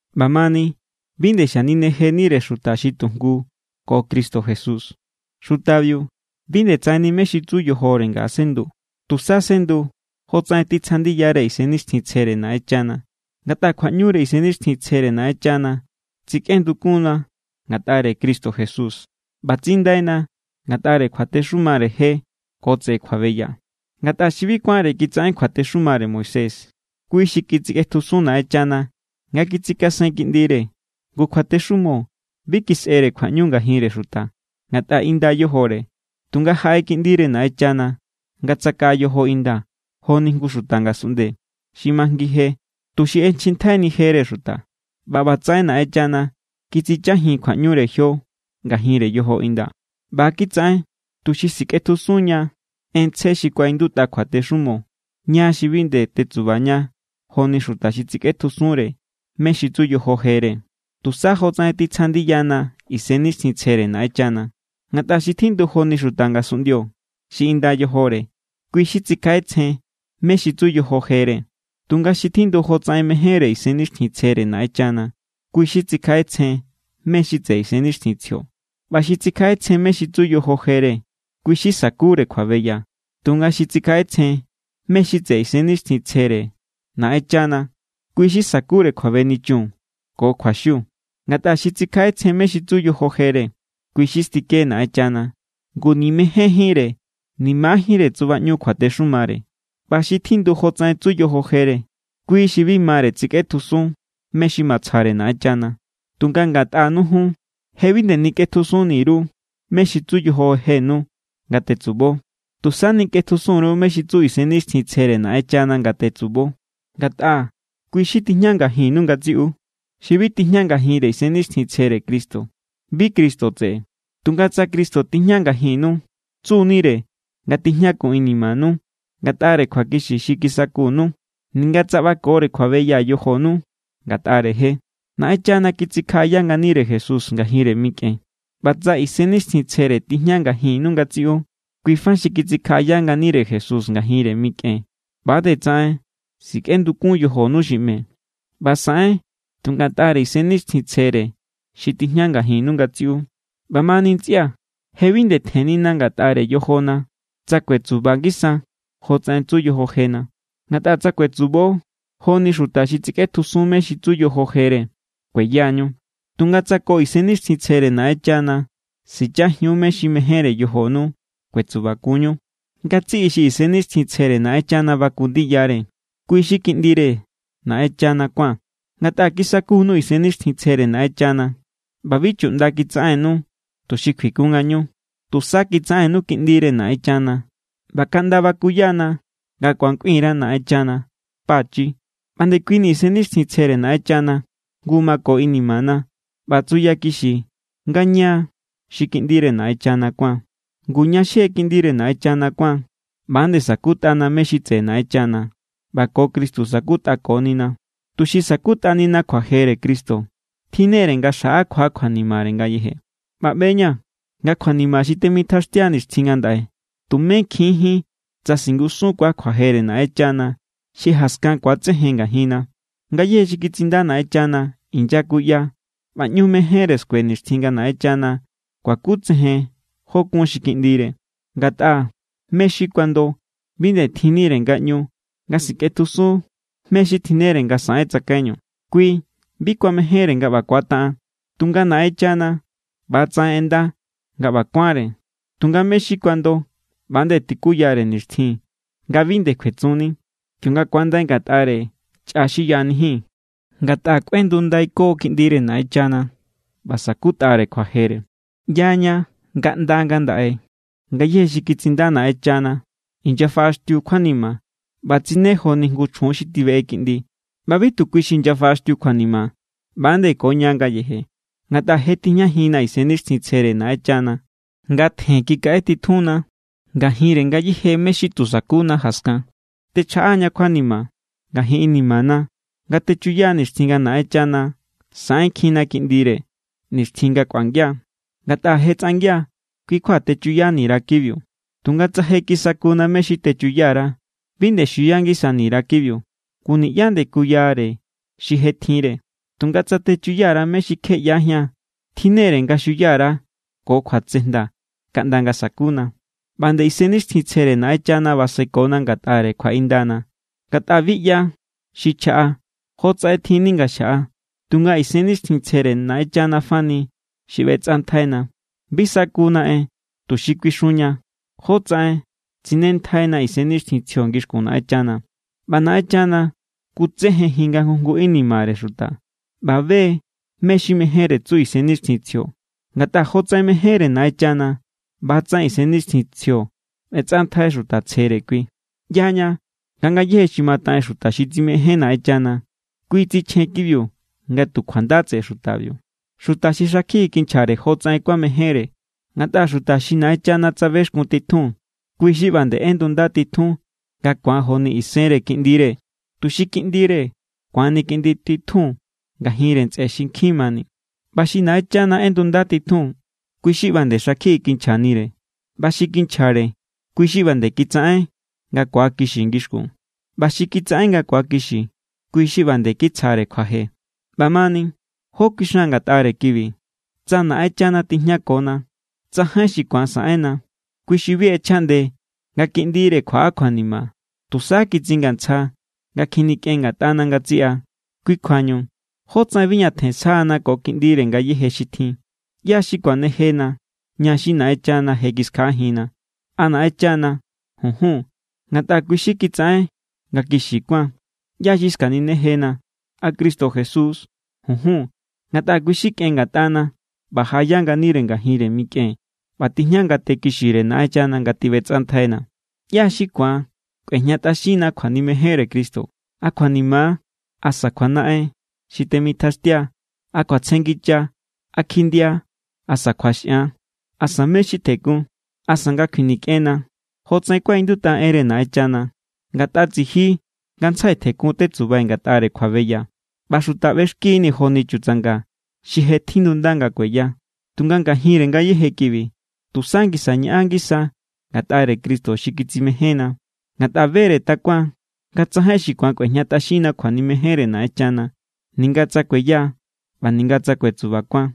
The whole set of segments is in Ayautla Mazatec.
ꞌBamani bi nde xaninejenire xuta xi tujngu ko Cristo Jesús. Xutabiu bi nde tsaꞌenni mé= xi tsu yojore nga sendu, tusa sendu jotsaꞌen titsja ndiyare Isennixtjintsjere Naꞌenchana. Ngatꞌa kjuaꞌñure Isennixtjintsjere Naꞌenchana tsikꞌendukunna ngatꞌare Cristo Jesús ꞌba tsindaina ngatꞌare kjuatexumare je ko tseꞌe kjuabeya. Ngatꞌa xi bi kuánre kitsaꞌen kjuatexumare Moisés, kui= xi kitsikꞌetjusun Naꞌenchana nga kitsikasen Kiꞌndire. Ngu kjuatexumo bi kisꞌere kjuaꞌñu ngajinre xuta, ngatꞌa inda= yojore. Tunga jaꞌe Kiꞌndire Naꞌenchana nga tsakaꞌa yojo inda joni jngu xuta ngasunꞌnde, xi majngi je, tuxi ꞌechjintjaini jere xuta. ꞌBa ꞌbatsaꞌen Naꞌenchana kitsichajin kjuaꞌñure jio ngajinre yojo inda. ꞌBa= kitsaꞌen tuxi sikꞌetjusunña en tsje xi kuaꞌindutꞌa kjuatexumo, ña xi bi nde tetsubaña joni xuta xi tsikꞌetjusunre mé= xi tsu yojo jere, tusá jotsaꞌen titsja ndiyana Isennixtjintsjere Naꞌenchana. Ngatꞌa xi tjindu joni xuta ngasunꞌndio xi inda yojore, kui= xi tsikjaꞌetsjen mé= xi tsu yojo jere. Tunga xi tjindu jotsaꞌen mejénre Isennixtjintsjere Naꞌenchana, kui= xi tsikjaꞌetsjen mé= xi tseꞌe Isennixtjintsjio. ꞌBa xi tsikjaꞌetsjen mé= xi tsu yojo jere, kui= xi sakure kjuabeya. Tunga xi tsikjaꞌetsjen mé= xi tseꞌe Isennixtjintsjere Naꞌenchana, kui= xi sakure kjuabenichun ko kjuaxiu. Ngatꞌa xi tsikjaꞌetsjen mé= xi tsu yojo jere, kui= xi stike Naꞌenchana. Ngu ni̱ mejénjínre ni̱ majiínre tsubaꞌñu kjuatexumare. ꞌBa xi tjindu jotsaꞌen tsu yojo jere, kui xi bi mare tsikꞌetjusun mé= xi matsjare Naꞌenchana. Tunga ngatꞌanu jun, je bi nde nikꞌetjusuni_ru mé= xi tsu yojo jenu nga tetsubo. Tusa nikꞌetjusun_ru mé= xi tsu Isennixtjintsjere Naꞌenchana nga tetsubo, ngatꞌa kui= xi tijña ngajinnu ngatsiꞌu. Xi bi tijña ngajinre Isennixtjintsjere Cristo, bi Cristo tseꞌe. Tunga tsa Cristo tijña ngajinnu, tsu=nire nga tijñakun inimanu ngatꞌare kjuakixi xi kisakunu, ninga tsa ꞌbakore kjuabeya yojonu ngatꞌare je. Naꞌenchana kitsikjaꞌaya nganire Jesús ngajinre mikꞌen. ꞌBa tsa Isennixtjintsjere tijña ngajinnu ngatsiꞌu, kuifa xi kitsikjaꞌaya nganire Jesús ngajinre mikꞌen ꞌba nde tsaꞌen sikꞌendukun yojonu xi ꞌme. ꞌBa saꞌen tu ngatꞌare Isennixtjintsjere xi tijña ngajinnu ngatsiꞌu. ꞌBamani ntsꞌia̱, je bi nde tjennina ngatꞌare yojona tsa kuetsuba ngisa jotsaꞌen tsu yojo jena. Ngatꞌa tsa kuetsubo joni xuta xi tsikꞌetjusun mé= xi tsu yojo jere, kueyañu. Tunga tsa ko Isennixtjintsjere Naꞌenchana sichajiun mé= xi mejénre yojonu, kuetsubakunñu. Ngatsiꞌi xi Isennixtjintsjere Naꞌenchana baku ndiyare, kui= xi kiꞌndire Naꞌenchana kuán. Ngatꞌa kisakunu Isennixtjintsjere Naꞌenchana, ꞌba bi chuꞌnda kitsaꞌennu, tuxi kjuikun ngañu. Tusa kitsaꞌennu kiꞌndire Naꞌenchana ꞌba kaꞌnda bakuyana nga ku̱an kꞌuin_ra Naꞌenchana: “Pachi.” ꞌBa ndekuini Isennixtjintsjere Naꞌenchana jngu mako inimana ꞌba tsuyakixi nga ña= xi kiꞌndire Naꞌenchana kuáan. Ngu, ña xi je kiꞌndire Naꞌenchana kuáan, ꞌba nde sa̱kutꞌana mé= xi tseꞌe Naꞌenchana, ꞌba ko Cristo sa̱kutꞌakonina. Tuxi sa̱kutꞌanina kjuajere Cristo, tjinnere nga xjaꞌakua kjuanimare ngayeje. ꞌBa ꞌbe=ña̱ nga kjuanima xi temitjaxtia nixtjin ngandaꞌe tumé kjinjín tsa singusunkuaa̱ kjuajere Naꞌenchana xi jaskan ku̱atsejen ngajinna. Ngayéje xi kitsinda Naꞌenchana inyakuya ꞌba ꞌñu mejénre skue nixtjin nga Naꞌenchana kuakutsejen jó= kun xi kiꞌndire. Ngatꞌa mé= xi kuando bi nde tjinnire ngaꞌñu nga sikꞌetjusun mé= xi tjinnere nga saꞌen tsakaiñu. Kui bi kuamejénre nga ꞌba kuataꞌen. Tunga Naꞌenchana ꞌba=tsaꞌen ꞌenda nga ꞌba kuánre. Tunga mé= xi kuando ꞌba=nde tikuyare nixtjin nga bi nde kjuetsunni, kionga ku̱andai ngatꞌare chꞌa xi yaꞌanijín. Ngatꞌa kꞌuendundaiko kiꞌndire Naꞌenchana ꞌba sa̱kutꞌare kjuajere. ꞌYaña nga ꞌnda ngandaꞌe ngayéje xi kitsinda Naꞌenchana inyafaꞌaxtiu= kjuanima ꞌba tsine joni jngu chjun xi tibeꞌe kiꞌndi. ꞌBa bi tu kui= xi inyafaꞌaxtiu kjuanima, ꞌba=nde ko ña ngayeje. Ngatꞌa je tijñajinna Isennixtjintsjere Naꞌenchana, nga tjen kikaꞌe titjunna ngajinre ngayéje mé= xi tu sakuna jaskan. Techjaꞌa=ña kjuanima ngajin inimana nga techuya nixtjin nga Naꞌenchana saꞌenkjinna kiꞌndire, nixtjin nga kꞌuangia. Ngatꞌa je tsꞌangia kui kjua techuyani_ra kibiu. Tunga tsa je kisakuna mé= xi techuya_ra, bi nde xiuya ngisani_ra kibiu. Ngu niꞌyá nde kuyare xi je tjinre. Tunga tsa techuya_ra mé= xi kje ꞌyajían, tjinnere nga xiuya_ra ko kjuatsejnda kaꞌnda nga sakuna. ꞌBa= nde Isennixtjintsjere Naꞌenchana basekona ngatꞌare kjuaꞌindana. Ngatꞌa bi ꞌya xi chjaꞌa jotsaꞌen tjinni nga xjaꞌa, tunga Isennixtjintsjere Naꞌenchana fani xi ꞌbetsꞌantjaina. Bi sakuna en tuxi kuixunña jotsaꞌen tsinentjaina Isennixtjintsjio ngixkun Naꞌenchana. ꞌBa Naꞌenchana kutsejenjin nga jngu jngu inimare xuta ꞌba be= mé= xi mejénre tsu Isennixtjintsjio. Ngatꞌa jotsaꞌen mejénre Naꞌenchana, ꞌba=tsaꞌen Isennixtjintsjio ꞌbetsꞌantjai xuta tsjere kui. ꞌYaña nga ngayéje xi mataꞌen xuta xi tsimején Naꞌenchana, kui tsichjen kibiu nga tu kjuanda tseꞌe xutabiu, xuta xi xakjiꞌi kinchjare jotsaꞌen kuamejénre. Ngatꞌa xuta xi Naꞌenchana tsabexkun titjun, kui= xi ꞌba nde ꞌendunda titjun nga ku̱an joni isenre Kiꞌndire, tuxi Kiꞌndire ku̱anni Kiꞌnditjun ngajinre ntsꞌe xi nkjin mani. ꞌBa xi Naꞌenchana ꞌendunda titjun, kui= xi ꞌba nde xakjiꞌi kinchjanire. ꞌBa xi kinchjare, kui= xi ꞌba nde kitsaꞌen nga kuakixi ngixkun. ꞌBa xi kitsaꞌen nga kuakixi, kui= xi ꞌba nde kitsjare kjuaje. ꞌBamani, ¿jó kuixan ngatꞌare kibi? Tsa Naꞌenchana tijñakona, tsajain xi ku̱an saꞌenna. Kui xi bi ꞌechjaꞌnde nga Kiꞌndire kjuaꞌa kjuanima, tusa kitsingantsja nga kjinikꞌen ngatꞌana ngatsiꞌa. Kui kjuañu, ¿jótsaꞌen bi ñatjen sjana ko Kiꞌndire ngayéje xi tjin? ¿ꞌYá= xi kuanejena, ña xi Naꞌenchana je kiskjaꞌajinna? ¿A Naꞌenchana? Junjun, ngatꞌa kui= xi kitsaꞌen nga kixi kuáan. ¿ꞌYá= xi skaninejena? ¿A Cristo Jesús=? Junjun, ngatꞌa kui= xi kꞌen ngatꞌana ꞌba jaꞌaya nganire ngajinre mikꞌen ꞌba tijña ngate kixire Naꞌenchana nga tiꞌbetsꞌantjainna. ¿ꞌYá= xi ku̱an kꞌuejñatꞌaxinna kjuanimejenre Cristo? ¿A kjuanima= asa kjuanaꞌen xi temitjaxtia? ¿A kjuatsjenngicha=, a kjindia asa kjuaxꞌan? ¿Asa mé= xi tjekun? ¿Asa nga kjuinikꞌenna? Jotsaꞌen kuaꞌindutꞌa enre Naꞌenchana: Ngatꞌa tsiji ngantsjai tjekun tetsubai̱ ngatꞌare kjuabeya, ꞌba xuta ꞌbexkini̱ joni chutsanga xi je tjindunda nga kueya. Tunga ngajinre ngayéje kibi, tusa ngisa ñaꞌan ngisa ngatꞌare Cristo xi kitsimejénna. Ngatꞌa be=re takuaa̱n nga tsajain xi ku̱an kꞌuejñatꞌaxinna kjuanimejenre Naꞌenchana, ninga tsa kueya ꞌba ninga tsa kuetsubakuan,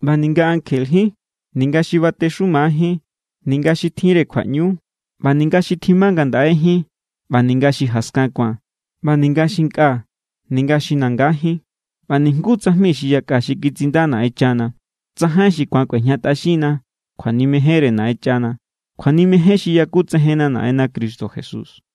ꞌba ninga ankjejín ninga xi batexumajín ninga xi tjinre kjuaꞌñu, ꞌba ninga xi tjima ngandaꞌejín ꞌba ninga xi jaskan ku̱an, ꞌba ninga xi nkꞌa= ninga xi nangajín, ꞌba nijngu tsajmi xi yakꞌa xi kitsinda Naꞌenchana. Tsajain xi ku̱an kꞌuejñatꞌaxinna kjuanimejenre Naꞌenchana, kjuanimejen xi yakutsejenna Naꞌenna Cristo Jesús.